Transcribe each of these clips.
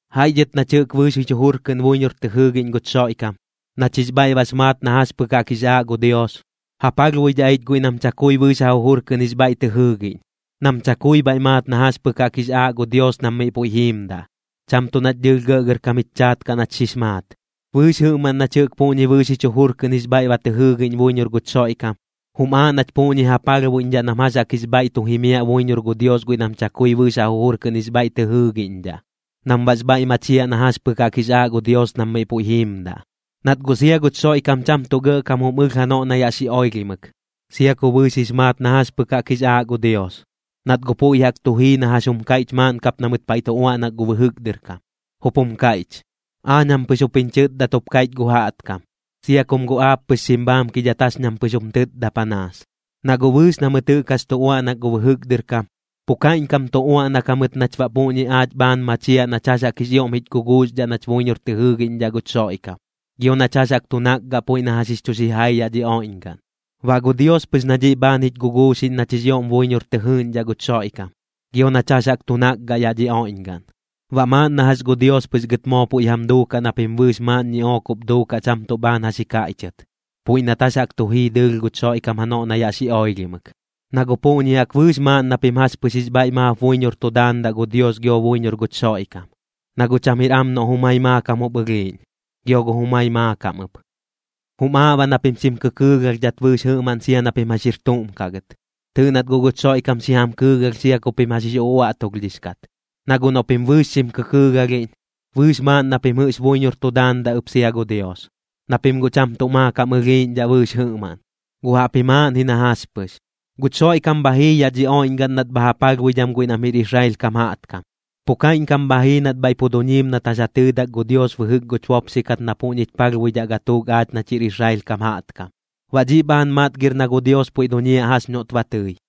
Jaiꞌ dhɨt nach jɨꞌk bɨɨx jich jujur kɨꞌn buiñor tɨ jɨɨgiꞌñ guch Xoiꞌkam, nach jix bhaiꞌ bax maat na jax pɨk jaꞌk jix aaꞌ gu Dios, ja palhbuidhaꞌ ich guiꞌ nam chakui bɨɨx ja jujur kɨꞌn jix bhaiꞌ tɨ jɨɨgiꞌñ, nam chakui bhaiꞌ maat na jax pɨk jaꞌk jix aaꞌ gu Dios nam miꞌ puiꞌ jiimdaꞌ, cham tuꞌ nach dɨɨlh gɇꞌgɇrkam jich chaat kaꞌ nach xix maat. Bɨɨx jɨꞌmaꞌn nach jɨꞌk puꞌñi bɨɨx jich jujur kɨꞌn jix bhaiꞌ ba tɨ jɨɨgiꞌñ buiñor guch Xoiꞌkam, jum aaꞌ nach puꞌñi ja palhbuiꞌñdhaꞌ nam jax jaꞌk jix bhaiꞌ tu jimiaꞌ buiñor gu Dios guiꞌ nam chakui bɨɨx ja jujur kɨꞌn jix bhaiꞌ tɨ jɨɨgiꞌñdhaꞌ, nam baꞌx bhaiꞌ machiaꞌ na jax pɨk jaꞌk jix aaꞌ gu Dios nam miꞌ puiꞌ jiimdaꞌ. Nat guꞌ sia guch Xoiꞌkam cham tuꞌ gɇꞌkam jum ɨlh janoꞌ na yaꞌ xi oilhimɨk, sia ku bɨɨx jix maat na jax pɨk jaꞌk jix aaꞌ gu Dios, nat guꞌ puiꞌ jaꞌk tu jii na jax jum kaiꞌch maaꞌn kap na mɨt paiꞌ tu uaꞌnak gu bɨjɨk dɨr kam, jup jum kaiꞌch: “Aañ jam pɨx jup jiñ chɨtdat jup kaiꞌch gu jaꞌtkam, sia kum guꞌ aap pɨx xim bhaamkidhat jax ñam pɨx jum tɨtda panaas.” Na guꞌ bɨɨx na mɨt jɨꞌk jax tu uaꞌnak gu bɨjɨk dɨr kam, pu kaiꞌñkam tu uaꞌnak jamɨt nach baꞌ puꞌñi aach bhaan machiaꞌ nach jax jaꞌk jix ioꞌm jich guguuxdhaꞌ nach buiñor tɨ jɨɨgiꞌñdhaꞌ guch Xoiꞌkam, gio nach jax jaꞌk tu nakgaꞌ puiꞌ na jax jix chu xijai yaꞌ dhi oiꞌñgaꞌn. Baꞌ gu Dios pɨx na dhiꞌ bhaan jich guguuxiꞌñ nach jix ioꞌm buiñor tɨ jɨɨgiꞌñdhaꞌ guch Xoiꞌkam, gio nach jax jaꞌk tu nakgaꞌ yaꞌ dhi oiꞌñgaꞌn. Baꞌ maaꞌn na jax gu Dios pɨx gɨt moo puiꞌ jam duukaꞌ na pim bɨɨx maaꞌn ñiꞌook jup duukaꞌ cham tuꞌ bhaan jax ji kaiꞌchɨt, puiꞌ nat jax jaꞌk tu jii dɨɨlh guch Xoiꞌkam janoꞌ na yaꞌ xi oilhimɨk. Na guꞌ puꞌñi jaꞌk bɨɨx maaꞌn na pim jax pɨx jix bhaiꞌ maap buiñor tu daandaꞌ gu Dios gio buiñor guch Xoiꞌkam, na guꞌ cham jir am noꞌ jumai maakam jup ɨlhiiꞌñ, gio gu jumai maakam ɨp. Jum aaꞌ baꞌ na pim xim kɨkɨɨgalhdhat bɨɨx jɨꞌmaꞌn sia na pim jax jir tuꞌm kaꞌ gɨt. Tɨɨꞌ nat guꞌ guch Xoiꞌkam xi jam kɨɨgalh sia ku pim jax jix uꞌuaꞌtulhdhix kat. Na guꞌ noꞌ pim bɨɨx xim kɨkɨɨgalhiꞌñ, bɨɨx maaꞌn na pim jɨꞌx buiñor tu daandaꞌ ɨp sia gu Dios, na pim guꞌ cham tuꞌ maakam ɨlhiiꞌñdhaꞌ bɨɨx jɨꞌmaꞌn, guꞌ jaꞌpji maaꞌn ji na jax pɨx. Guch Xoiꞌkam bha jii yaꞌ dhi oiꞌñgaꞌn nat bha ja palhbuidham guiꞌ nam jir Israel kam jaꞌtkam, pu kaiꞌñkam bha jii nat bhaiꞌ pu duñiim nat jax ja tɨɨdak gu Dios bɨjɨk guch bopxi kat na puꞌñich palhbuidhaꞌ gatuuk aach nach jir Israel kam jaꞌtkam. Baꞌ dhiꞌ bhaan matgir na gu Dios puiꞌ duñiaꞌ jax noꞌt ba tɨi.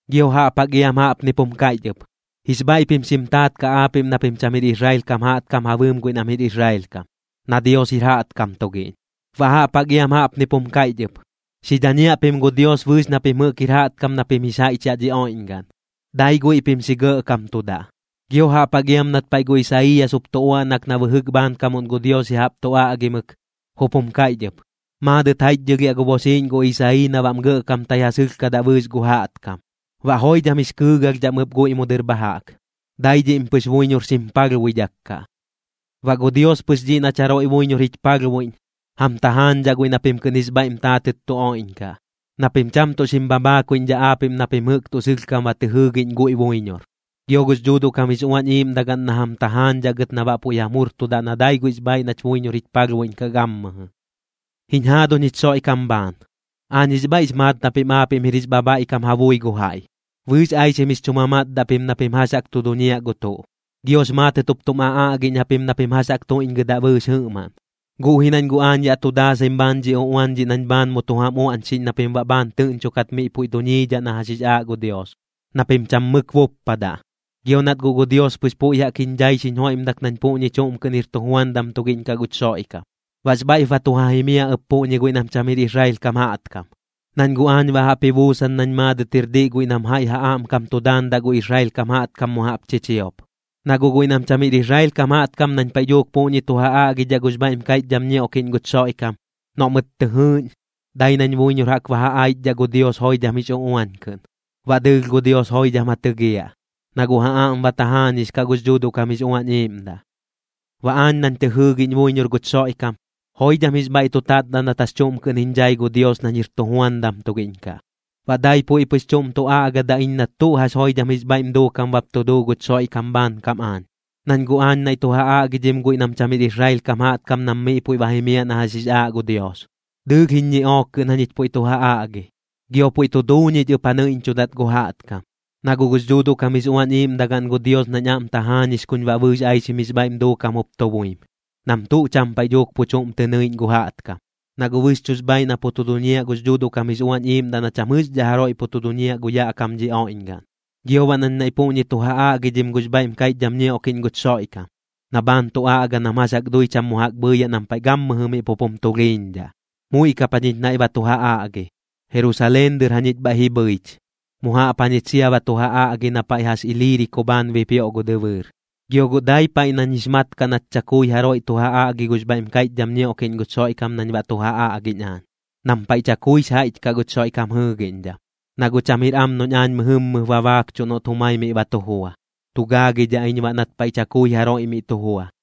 Gio jaꞌp jaꞌk iam jaꞌpnip jum kaiꞌch ɨp: Jix bhaiꞌ pim xim taat kaꞌ aapiꞌm na pim cham jir Israel kam jaꞌtkam ja bɨɨm guiꞌ nam jir Israel kam, na Dios jir jaꞌtkam tugiꞌñ. Baꞌ jaꞌp jaꞌk iam jaꞌpnip jum kaiꞌch ɨp: Xi dhañiaꞌ pim gu Dios bɨɨx na pim jɨꞌk jir jaꞌtkam na pim jix jaiꞌch yaꞌ dhi oiꞌñgaꞌn, dai guiꞌ pim xi gɇꞌkamtudaꞌ. Gio jaꞌp jaꞌk iam nat paiꞌ gu Isaiiyas jup tu uaꞌnak na bɨjɨk bhaankamuꞌn gu Dios ya jaꞌp tu aꞌgimɨk, jup jum kaiꞌch ɨp: Maadɨt jaiꞌchdhɨlhiaꞌ gu boxiiꞌñ gu Isayii na baꞌm gɇꞌkamtai ja sɨlhkadaꞌ bɨɨx gu jaꞌtkam. Baꞌ joidham jix kɨɨgalhdhaꞌm ɨp guiꞌ mu dɨr bha jaꞌk, dai dhiꞌm pɨx buiñor xim palhbuidhak kaꞌ. Baꞌ gu Dios pɨx dhiꞌ nach jaroiꞌ buiñor jich palhbuiꞌñ, jam tajaañdhaꞌ guiꞌ na pim kɨꞌn jix bhaiꞌm taatɨt tu oiꞌñkaꞌ, na pim cham tuꞌ xim bhabhaakuiꞌñdhaꞌ aapiꞌm na pim jɨꞌk tuꞌ sɨlhkam ba tɨ jɨɨgiꞌñ guiꞌ buiñor. Gio gux Dhuuduꞌ kam jix Uañ Iiꞌmdagaꞌn na jam tajaañdhaꞌ gɨt na baꞌ puiꞌ jam jurtudaꞌ na dai guiꞌx bhaaiꞌ nach buiñor jich palhbuiꞌñkaꞌ gammɨjɨ. Jiñ jaaduñ jich Xoiꞌkam bhaan, aañ jix bhaiꞌx maat na pim aapiꞌm jir jix bhabhaiꞌkam ja bui gu jaiꞌ, bɨɨx aixim jix chu mamatdaꞌ pim na pim jax jaꞌk tu duñiaꞌ gu tuꞌ, giox maatɨt jup tum aꞌaꞌgiꞌñ japim na pim jax jaꞌk tuiꞌñgɨdaꞌ bɨɨx jɨꞌmaꞌn. Guꞌ ji nañ guꞌ aañ yaꞌ tu daasaim bhaan dhi uꞌuan dhiꞌ nañ bhaan mu tu jam uaꞌñxiꞌñ na pim baꞌ bhaan tɨꞌñchokat miꞌ puiꞌ duñiidhaꞌ na jax jix aaꞌ gu Dios, na pim cham mɨk buppadaꞌ. Gio nat guꞌ gu Dios pɨx puiꞌ jaꞌk jiñ dhai xiñ joiꞌmdak nañ puꞌñi chuꞌm kɨꞌn jir tujuandam tugiꞌñ kaꞌ guch Xoiꞌkam. Baꞌx bhaiꞌp ba tu ja jimiaꞌ ɨp puꞌñi guiꞌ nam cham jir Israel kam jaꞌtkam, nañ guꞌ aañ baꞌ jaꞌp ji buusan nañ maadɨt jir diꞌ guiꞌ nam jaiꞌ ja aꞌmkam tu daandaꞌ gu Israel kam jaꞌtkam mu jaꞌp chichiop. Na guꞌ guiꞌ nam cham jir Israel kam jaꞌtkam nañ paiꞌ dhuuk puꞌñi tu ja aꞌgidhaꞌ gux bhaiꞌm kaiꞌchdham ñioꞌkiꞌñ guch Xoiꞌkam, noꞌ mɨt tɨ jɨɨꞌñ, dai nañ buiñor jaꞌk ba ja aichdhaꞌ gu Dios joidham jix uꞌuañ kɨꞌn. Baꞌ dɨɨlh gu Dios joidham ja tɨgiaꞌ, na guꞌ ja aꞌm ba tajaañix kaꞌ gux Dhuuduꞌ kam jix Uañ Iiꞌmdaꞌ. Baꞌ aañ nañ tɨ jɨɨgiꞌñ buiñor guch Xoiꞌkam, joidham jix bhaiꞌ tu tatdaꞌ nat jax chuꞌm kɨꞌn jiñ dhai gu Dios nañ jir tujuandam tugiꞌñ kaꞌ. Baꞌ dai puiꞌ pɨx chuꞌm tu aꞌgadaꞌ iñ nat tuꞌ jax joidham jix bhaiꞌm duukam bap tu duu guch Xoiꞌkam bhaankam aañ, nañ guꞌ aañ naiꞌ tu ja aꞌgidhim guiꞌ nam cham jir Israel kam jaꞌtkam nam miꞌ puiꞌ ba jimiaꞌ na jax jix aaꞌ gu Dios. Dɨɨlh jiñ ñiꞌook kɨꞌn jañich puiꞌ tu ja aꞌgi, gio puiꞌ tu duu ñich ɨp ja nɨiꞌñchudat gu jaꞌtkam. Na guꞌ gux Dhuuduꞌ kam jix Uañ Iiꞌmdagaꞌn gu Dios nañ aꞌm tajaañix kuñ baꞌ bɨɨx aixim jix bhaiꞌm duukam jup tu buim, nam tuꞌ cham paiꞌ dhuuk pu chuꞌm tɨ nɨiꞌñ gu jaꞌtkam. Na guꞌ bɨxchuꞌx bhaaiꞌ na pu tu duñiaꞌ gux Dhuuduꞌ kam jix Uañ Iiꞌmdaꞌ na cham jɨꞌxdhaꞌ jaroiꞌ pu tu duñiaꞌ gu yaꞌ kam dhi oiꞌñgaꞌn. Gio baꞌ nañ naiꞌ puꞌñi tu ja aꞌgidhidhaꞌ gux bhaiꞌm kaiꞌchdham ñioꞌkiꞌñ guch Xoiꞌkam, na bhaan tu aꞌga nam jax jaꞌk dui cham mu jaꞌk bhɨɨyaꞌ nam paiꞌ gammɨjɨ miꞌ pup jum tulhiiñdhaꞌ. Muiꞌ kap jañich naiꞌ ba tu ja aꞌgi, Jerusaleen dɨr jañich bhaiꞌ ji bhɨich, mu jaꞌp jañich sia ba tu ja aꞌgi na paiꞌ jax Iliiriko bhaan bipioꞌ gu dɨbɨɨr. Gio guꞌ dai paiꞌ nañ jix mat kaꞌ nat chakui jaroiꞌ tu ja aꞌgi gux bhaiꞌm kaiꞌchdham ñioꞌkiꞌñ guch Xoiꞌkam nañ baꞌ tu ja aꞌgiꞌñ aañ, nam paiꞌ chakuix jaiꞌch kaꞌ guch Xoiꞌkam jɨɨgiꞌñdham. Na guꞌ cham jir am noꞌñ aañ mɨjɨmmɨp ba baakchuꞌ noꞌt jumai miꞌ ba tu jua, tu gaagidhaꞌ iñ baꞌ nat paiꞌ chakui jaroiꞌ miꞌ tu jua.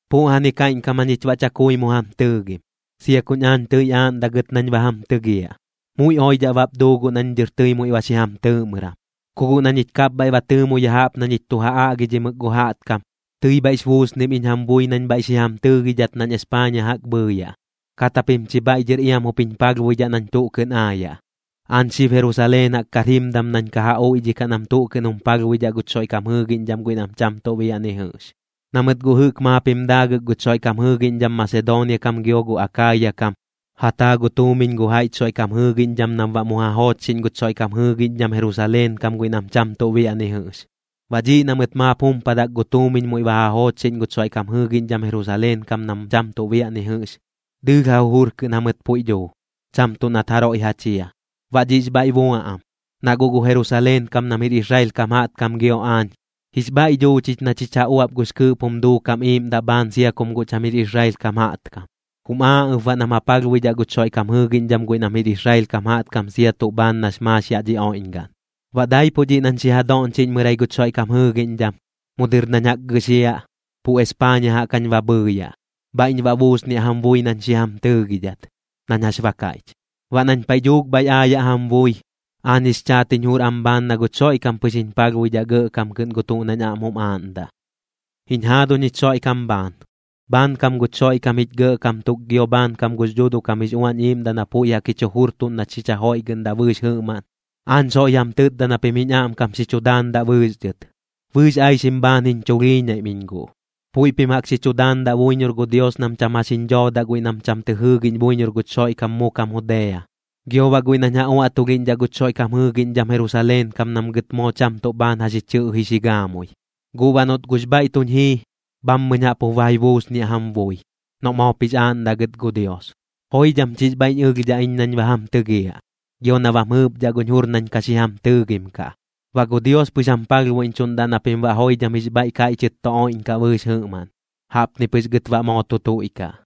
Puꞌjani kaiꞌñkam jañich baꞌ chakui mu jam tɨɨgim, sia kuñ aañ tɨi aaꞌndaꞌ gɨt nañ ba jam tɨgiaꞌ. Muiꞌ oidhaꞌ bap duu guꞌ nañ dɨr tɨi muiꞌ ba xi jam tɨɨꞌmɨram, ku guꞌ na ñich kapbhaiꞌ ba tɨɨmo ya jaꞌp na ñich tu ja aꞌgidhimɨk gu jaꞌtkam, tɨi bhaiꞌx buusnim iñ jam bui nañ bhaiꞌ xi jam tɨɨgidhat nañ Espaaña jaꞌk bhɨɨyaꞌ, kat japim chi bhaiꞌ dhɨr iam jup jiñ palhbuidhaꞌ nañ tuꞌ kɨꞌn aayaꞌ. Aañ xib Jerusaleen jaꞌk kar jimdam nañ ka ja uiꞌdhikaꞌ nam tuꞌ kɨꞌn jum palhbuidhaꞌ guch Xoiꞌkam jɨɨgiꞌñdham guiꞌ nam cham tuꞌ biaꞌ ni jɨꞌx. Na mɨt guꞌ jɨꞌk maap jim daagɨk guch Xoiꞌkam jɨɨgiꞌñdham Masedoonia kam gio gu Akaaya kam, ja taa gu tuumiñ gu jaiꞌch Xoiꞌkam jɨɨgiꞌñdham nam baꞌ mu ja joochxiꞌñ guch Xoiꞌkam jɨɨgiꞌñdham Jerusaleen kam guiꞌ nam cham tuꞌ biaꞌ ni jɨꞌx. Baꞌ dhiꞌ na mɨt maap jumpadak gu tuumiñ muiꞌ ba ja joochxiꞌñ guch Xoiꞌkam jɨɨgiꞌñdham Jerusaleen kam nam cham tuꞌ biaꞌ ni jɨꞌx, dɨɨlh ja jujur kɨꞌn jamɨt puiꞌ dhuu, cham tuꞌ nat jaroiꞌ ja chia. Baꞌ dhiꞌx bhaiꞌ bua am, na guꞌ gu Jerusaleen kam nam jir Israel kam jaꞌtkam gio aañ, jix bhaiꞌ dhuu chich na chich ja uaꞌp gux kɨɨꞌp jum duukam iiꞌmdaꞌ bhaan sia kum guꞌ cham jir Israel kam jaꞌtkam, jum aaꞌ ɨp baꞌ nam ja palhbuidhaꞌ guch Xoiꞌkam jɨɨgiꞌñdham guiꞌ nam jir Israel kam jaꞌtkam sia tuꞌ bhaan nax maax yaꞌ dhi oiꞌñgaꞌn. Baꞌ daipuꞌ dhiꞌ nañ xi ja doꞌñchiꞌñmɨrai guch Xoiꞌkam jɨɨgiꞌñdham, mu dɨr nañ jaꞌk gɨxiaꞌ, pu Espaaña jaꞌk jañ ba bhɨɨyaꞌ. Bhaiꞌñ baꞌ buusniaꞌ jam bui nañ xi jam tɨɨgidhat, nañ jax ba kaiꞌch. Baꞌ nañ paiꞌ dhuuk bhaiꞌ aayaꞌ jam bui, aañ jix chaat jiñ jur am bhaan na guch Xoiꞌkam pɨx jiñ palhbuidhaꞌ gɇꞌkam kɨꞌn gu tuꞌ nañ aꞌm jum aaꞌndaꞌ. Jiñ jaaduñ jich Xoiꞌkam bhaan, bhaankam guch Xoiꞌkam jich Gɇꞌkam tuk gio bhaankam gux Dhuuduꞌ kam jix Uañ Iiꞌmdaꞌ na puiꞌ jaꞌk jich jujurtuꞌn nach xich jajoiꞌgɨꞌndaꞌ bɨɨx jɨꞌmaꞌn, aañ soiꞌ jam tɨtda na pim jiñ aꞌmkam xi chu daandaꞌ bɨɨx dhɨt. Bɨɨx aixim bhaan jiñ chulhiiñaim iñ guꞌ. Puiꞌ pim jaꞌk xi chu daandaꞌ buiñor gu Dios nam cham jax jiñ dhoodaꞌ guiꞌ nam cham tɨ jɨɨgiꞌñ buiñor guch Xoiꞌkam mu kam Judea, gio baꞌ guiꞌ nañ ja uaꞌtulhiꞌñdhaꞌ guch Xoiꞌkam jɨɨgiꞌñdham Jerusaleen kam nam gɨt moo cham tuꞌ bhaan jax ji chɨꞌji xi gaamui. Guꞌ baꞌ noꞌt guꞌx bhaiꞌ tuñ jii, bhammɨñ jaꞌp jup ba ji buusniaꞌ jam bui, noꞌ moop jix aaꞌndaꞌ gɨt gu Dios. Joidham chix bhaiꞌñ ɨlhdhaꞌ iñ nañ ba jam tɨgiaꞌ, gio na bam jɨɨpdhaꞌ guñ jur nañ ka xi jam tɨɨgim kaꞌ. Baꞌ gu Dios pɨx jam palhbuiꞌñchuꞌndaꞌ na pim baꞌ joidham jix bhaiꞌ kaiꞌchɨt tu oiꞌñkaꞌ bɨɨx jɨꞌmaꞌn. Jaꞌpni pɨx gɨt baꞌ moo tu tuiꞌkaꞌ.